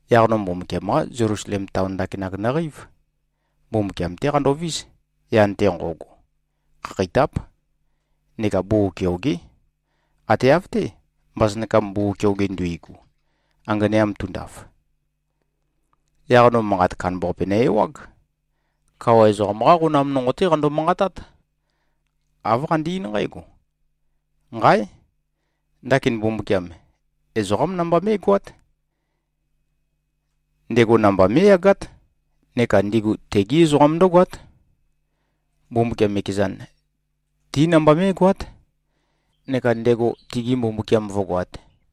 Yaq no Mbumbukiam-qá Zelusalem taon ndakinak nøqeív. Mbumbukiam-té qandovís, yan-te nqo꞉go. Khakheitáp neka bugug keogé. Ate av-té, mbasønakam bugug keoge nduigu, anganea tundaf. Yaq no manqat kandambaqape nø-ewág. Kawa ezoqam-qá qonam nonqo-té qando-manqatát. Āv qande-eín nqǽgo, “Nqáe! Ndakin Mbumbukiam, ezoqám namba mé꞉goát. Ndego namba mé꞉yagát. Neka ndigu tegí ezoqam ndǿgoát. Mbumbukiam ekezan, ti namba mé꞉goát, neka ndego tigi Mbumbukiam vǿgoāt.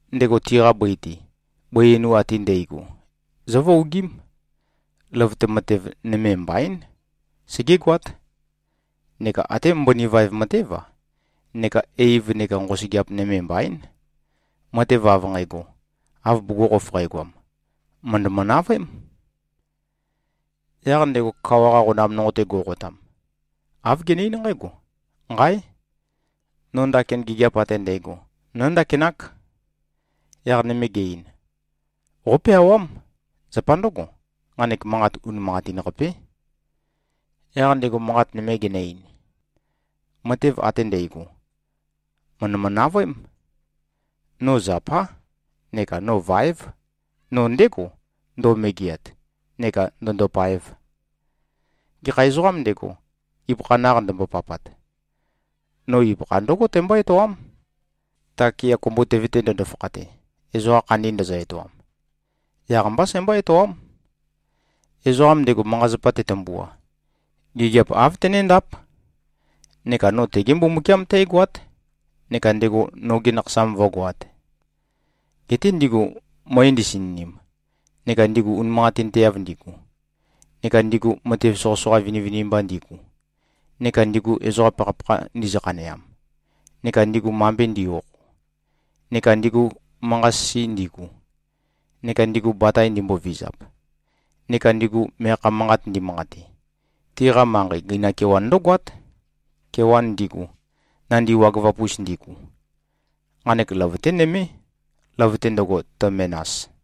Ndego tiqa bøi-te, bøi einu ate ndægo zǿvuogím. Løvøte matev nøme mbaín, segégoát, neka até mbøni vaev matév-a, neka eiv neka nqosøgeap nøme mbaín. Matev av nqægo, av bugukhokhof qægoam, mø̀ndømø-navøém.” Yaq ndego kawa-qa qonam nonqo-te go꞉qotam, āv gene-eín nqǽgo, “Nqáe! No ndakin gigiap ate ndægo nóndakinák.” Yaq nøme ge-ein, “Qópeawám. Zapa ndǿgo, nqanek manqat, unimanqatin-qapé.” Yaq ndego manqat nøme genø-ein, “Matev ate ndægo, mø̀ndømø-navøém. No zapá neka no váev. No ndégo, ndo꞉megeat neka ndø̄ndōpāēv. Gekha ezoqām ndego, ibøkha naq ndømbopapat, no ibøkha ndǿgo tæmbó-etoám, ta kea kumbutøve-te ndøndo-fakhate, ezoqa khandi ndøzø-etoam. Yaq-mbá sæmbó-etoám. Ezoqam ndego, manqa-zapa tetømbua, gigiap āv tenéndáp. Neka no tegé Mbumbukiam tǽgoát neka ndego noge nakhasam vǿgoāt. Geté ndigu møe ndisininim, neka ndigu unimanqatinteav ndigu, neka ndigu matev soqøsoqa vinivinimba ndigu, neka ndigu ezoqa pakhapakha ndizø-khaneam, neka ndigu mambe ndi꞉-okho, neka ndigu manqa-sisi ndigu, neka ndigu batae ndimbovizap, neka ndigu meakha manqat ndimanqate, tiqa manqei gøinam kewan ndǿgoát, kewan ndigu, nandi wagøvap-us ndigu. Nqanek løvøté nømé, løvøte ndøgo, tø-menas.”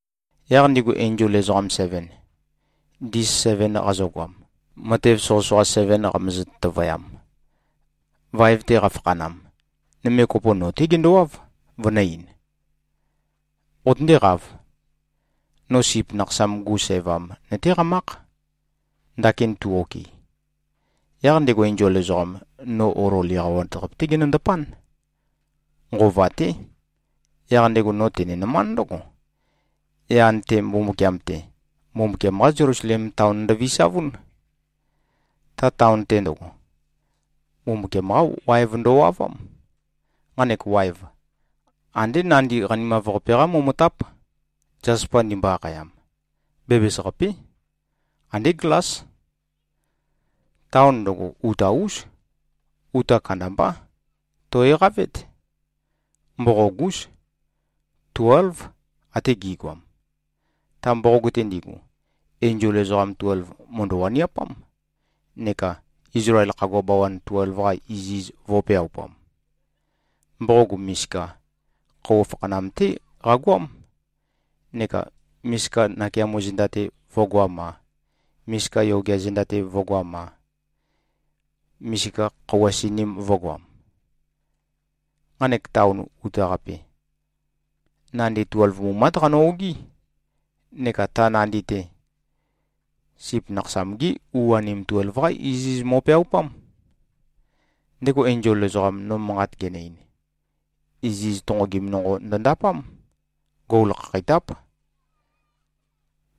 Yaq ndigu enzol ezoqam seven, ndis seven qazøgoam, matev soqøsoqa seven qamøzø-tøtøvøyam, vaev-te qafakhanam, nøme kopo, no-té gendowáv, vønø̄-ein, “Qotøndéqāv! No Sip Nakhasam-gu sævam nøtéqamákh, ndakin tu-okɨ.” Yaq ndego enzol ezoqam, no olol eqawat-qape-té genøndapán. Nqova-té. Yaq ndego no tene-nømánd ndǿgo: Yan-te, Mbumbukiam-te, Mbumbukiam-qá Zelusalem taon ndøvisavún. Ta taon-te ndøgo, Mbumbukiam-qá waev ndøwavám. Nqanek waev, andé nandi qanimav-qape-qá momotáp, zaspa ndimbo-akhayam. Bæbæs-qapé. Andé glás. Taon ndøgo, uta-ús. Uta kandambá. Tò꞉-eqavét. Mboqog-ús. Tuélv, ate gi꞉goam. Ta mboqog-te ndigu, enzol ezoqam tuelv, mø̀ndø-waniapám, neka Izlael khagua bawan tuelv-qa iziz vō꞉peaupam. Mboqog misika, khøuwa fakhanam-té qagoám, neka misika nakeamo zenda-te vø̄goam-a, misika yogea zenda-te vø̄goam-a, misika khøuwa sininim-te vø̄goam. Nqanek taon uta-qape, nandi tuelv mumát qano-ogií. Neka ta nandi-te, Sip Nakhasam-gí u-anim tuelv-qá iziz mo꞉peaupám. Ndego enzol ezoqam, no manqat genø-ein, iziz tonqogim nonqo ndøndapám. Gol khakheitáp.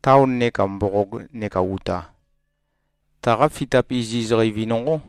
Taon neka mboqog neka uta, taqa fitap iziz qeivi nonqó.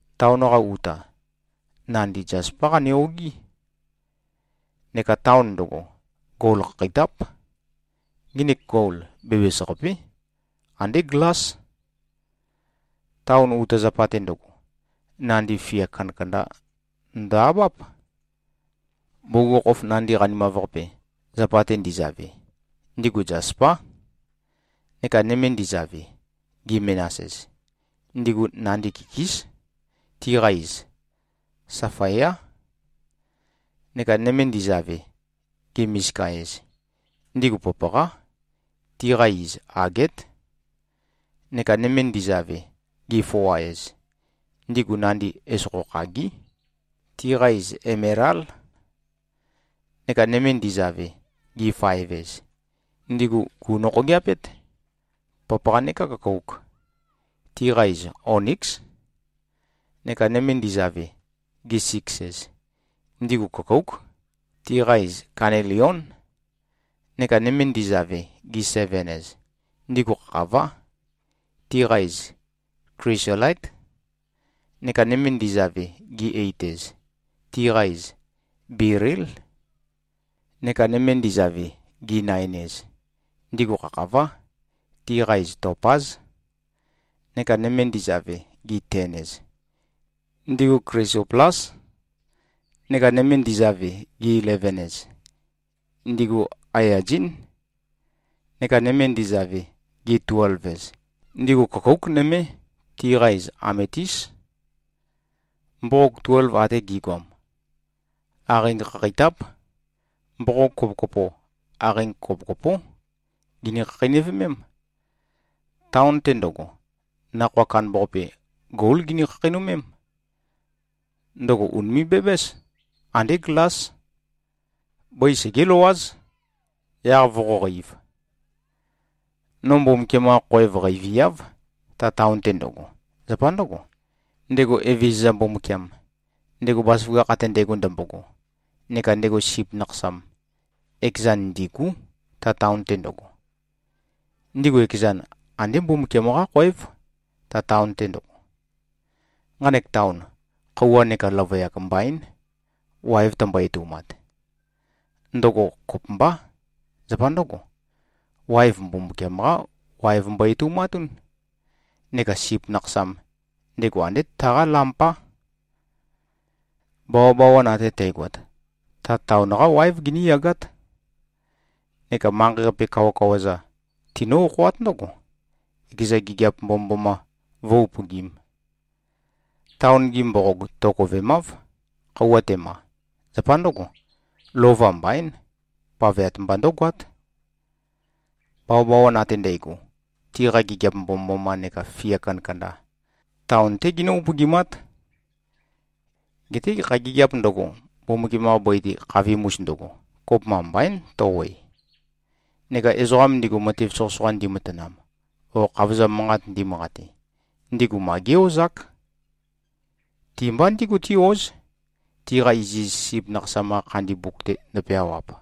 Taon-qa uta, nandi zaspá qane-ogií. Neka taon ndøgo, gol khakheitáp. Nginik gol, bæbæs-qapé. Andé glás. Taon uta zapa-te ndøgo, nandi fia kandakanda ndø-abáp. Bugukhokhof nandi qanimav-qape, zapa-te ndizave, ndigu zaspá. Neka nøme ndizave, gi-menas-ez, ndigu nandi kikís. Tiqa iz safaiá. Neka nøme ndizave, gi-misika-ez, ndigu papaqá. Tiqa iz agét. Neka nøme ndizave, gi-foa-ez, ndigu nandi esokho khagí. Tiqa iz emelál. Neka nøme ndizave, gi-faev-ez, ndigu gùnokhogeapét, papaqa neka køkouk. Tiqa iz oníks. Neka nøme ndizave, gi-siks-ez, ndigu køkóuk. Tiqa iz kanelión. Neka nøme ndizave, gi-seven-ez, ndigu khakhavá. Tiqa iz klisolaít. Neka nøme ndizave, gi-eit-ez, tiqa iz belíl. Neka nøme ndizave, gi-nain-ez, ndigu khakhavá. Tiqa iz topáz. Neka nøme ndizave, gi-ten-ez, ndigu klisoplás. Neka nøme ndizave, gi-eleven-ez, ndigu aiyazín. Neka nøme ndizave, gi-tuelv-ez, ndigu køkóuk nømé. Tiqa iz ametís. Mboqog tuelv ate gi꞉goam, aqeing khakheitáp. Mboqog kopokopo, aqeing kopokopó gini-khakheinøvemém. Taon-te ndøgo, nakhoa kandambaqape, gól gini-khakheinømém. Ndøgo ùnime꞉-bæbǽs. Andé glás. Bøi segé-løwáz, yaq voqóqeīv. No Mbumbukiam-qa khoev qeiviáv, ta taon-te ndøgo. Zapa ndǿgo, ndego Evezøza Mbumbukiam, ndego bazaføgakh ate ndægo ndømbogo, neka ndego Sip Nakhasam, ekezan ndîgú, ta taon-te ndøgo. Ndigu ekezan, andé Mbumbukiam-qá khoév, ta taon-te ndøgo. Nqanek taon, khøuwa neka løvøyak mbaín, waev tømbo-etoumat. Ndøgo kopømbá. Zapa ndǿgo, waev Mbumbukiam-qá waev mbo-etoumatún. Neka Sip Nakhasam, ndego andé taqá lampá. Bawabawan ate tægoat, ta taon-qá wáev giníyagát. Neka manqei-qape kawakawa-za tinǿ-okhoát ndǿgo, ekeza gigiap mbomømboma vǿ-upøgīm. Taon-gi mboqog tokovemáv, khøuwa tema. Zapa ndǿgo, lova mbaín. Paveat mba ndǿgoát. Bawabawan ate ndægo, tiqa gigiap mbomømboma neka fia kandakanda, taon-té ginǿ-upøgimát. Geté gekha gigiāp ndøgo, Mbumbukiam-qa bøi-te khavim-us ndøgo, kopømba mbaín, tø-oe. Neka ezoqa ndigu matev soqøsoqa ndimatanam o khavozam manqat ndimanqate, ndigu ma gé-ozák. Ti-mba ndígu tí-óz, tiqa iziz Sip Nakhasam-qa khandi mbuk-te ndøpeawap.